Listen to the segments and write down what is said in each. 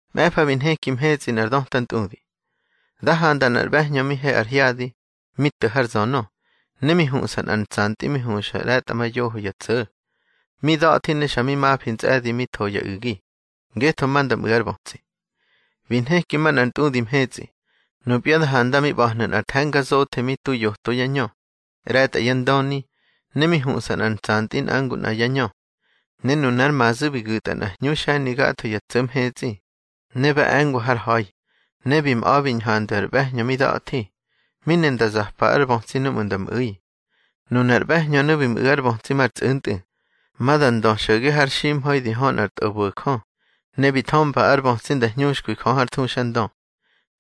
Mꞌe̱fa bi nheki mhetsꞌi nꞌar döta ntꞌudi. Da handa nꞌar ꞌbe̱hñö mi he ar hyadi, mi to̱ har zönö, ne mi huꞌsa nꞌar ntsantꞌi mi huxa ꞌre̱tꞌamayoho ya tso̱. Mi da̱thi ne xa mi mafi ntsꞌe̱di mi tho ya u̱gi, ngetho ma nda mꞌu̱ ár bötsi. Bi nheki manꞌar ntꞌudi mhetsꞌi. Nupya da handa mi ꞌba̱hnu̱ nꞌar the̱nga zothe mi tu yoto yá ñö, ꞌre̱tꞌa yá ndöni, ne mi huꞌsa nꞌar ntsantꞌi nꞌa ngu nꞌa yá ñö. Ne nunár mazu̱ bi gu̱tꞌa nꞌa hñu xe̱ni gatho ya tso̱ mhetsꞌi, ne ba e̱ngwa har ha̱i. Ne bi mꞌa̱ bi ñhandwi ar ꞌbe̱hñö mi da̱thi, mi ne nda zapa ár bötsi núꞌmu̱ nda mꞌu̱i. Nunar ꞌbe̱hñönu̱ bi mꞌu̱ ár bötsi mar tsꞌu̱ntꞌu̱, ma da ndö xo̱ge har ximha̱i di hö nꞌar tꞌobo̱jö. Ne bi thömba ár bötsi da hñuxkwi Jö hár thuxandö.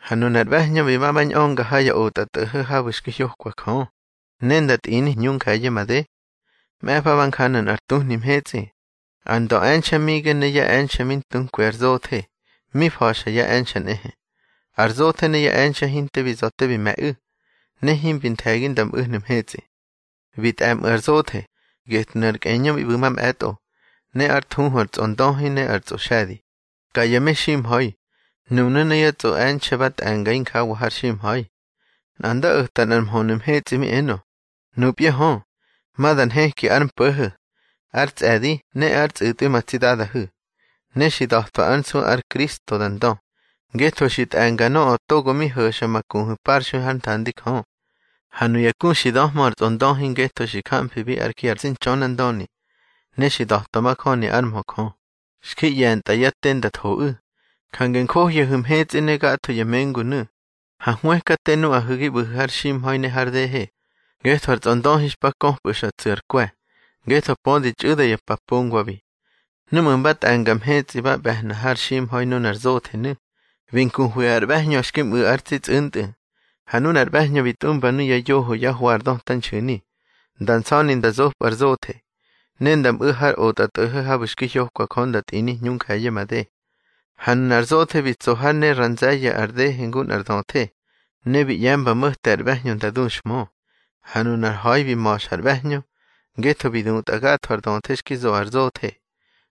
Ha nunar ꞌbe̱hñö bi ma ba ñꞌönga ha ya otꞌatꞌo̱ho̱ habu̱ xki hyokwabi Jö, ne nda tꞌini hñu nje̱ye̱ made. Mꞌe̱fa ba njanu̱ nꞌar tuhni mhetsꞌi. Ar ndöꞌe̱nxe̱ Mige ne yá e̱nxe̱ mi ntunkwi ar zothe, mi fa̱xa yá e̱nxe̱ nꞌehe. Ar zothe ne yá e̱nxe̱ hinte bi za̱ te bi me̱ꞌu̱, ne himbi nthe̱gi nda mꞌu̱hnu̱ mhetsꞌi. Bi tꞌe̱mꞌu̱ ar zothe, getnu̱ ar kꞌeñö mi ꞌbu̱ mamꞌe̱tꞌo, ne ár thuhu ar tsꞌondöhi ne ar tsꞌoxe̱di, ka ya meximha̱i. Nunu̱ ne yá tsꞌoꞌe̱nxe̱ ba tꞌe̱nga injawa har ximha̱i. Nꞌa nda o̱ta nꞌar mhönu̱ mhetsꞌi mi enö: —Nupya hö, ma da nheki ár mpo̱ho̱, ár tsꞌe̱di ne ár tsꞌu̱tꞌwi ma tsi Dadahu̱. Ne xi da̱twa ár nsu ár Kristo da ndö, ngetho xi tꞌe̱nga nöꞌö togo mi ho̱xa ma kuhu̱ parxui hár nthandi Jö. Ha nuya ku xi döhmö ar tsꞌondöhi ngetho xi jamfibi ár ji ar tsi Ntxönandöni, ne xi da̱twa majöni ár mhö Jö, xki ꞌye̱ntꞌa yá te nda thoꞌu̱. Jange njohyahu̱ mhetsꞌi ne gatho ya mengunu̱. Ha hwëkate nuꞌahu̱ gi ꞌbu̱hu̱ har ximha̱i ne har dehe, ngetho ar tsꞌondöhi xpa köpꞌu̱ xa tsu̱ ar kwe̱, ngetho pödi txꞌu̱da ya pa pongwabi. Núꞌmu̱ mba tꞌe̱nga mhetsꞌi ba ꞌbe̱hna har ximha̱i nunar zothenu̱, bi nkuhwi ar ꞌbe̱hñö xki mꞌu̱ ár tsi tsꞌu̱ntꞌu̱. Ha nunar ꞌbe̱hñö bi tꞌumba nuya yoho yá hwa ar döta nxu̱ni, nda nsa̱ni nda zopꞌu̱ ar zothe. Ne nda mꞌu̱ har otꞌatꞌo̱ho̱ habu̱ xi hyokwa Jö nda tꞌini hñunje̱ye̱ made. Ha nunar zothe bi tso hár ne ra nze̱ye̱ ar dehe ngu nꞌar döthe, ne bi ꞌye̱mba mo̱te ar ꞌbe̱hñö nda duxhmö. Ha nunar ha̱i bi ma̱xa ar ꞌbe̱hñö, ngetho bi dutꞌa gatho ar döthe xki zo ar zothe.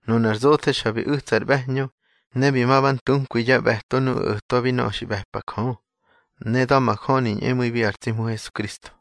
Nunar zothe xa bi u̱tsa ar ꞌbe̱hñö, ne bi ma ba ntunkwi yá ꞌbe̱to nuꞌu̱ o̱twabi nöꞌö xi ꞌbe̱pa Jö, ne da̱majöni ñꞌemu̱ibi ar tsi Hmu Hesukristo.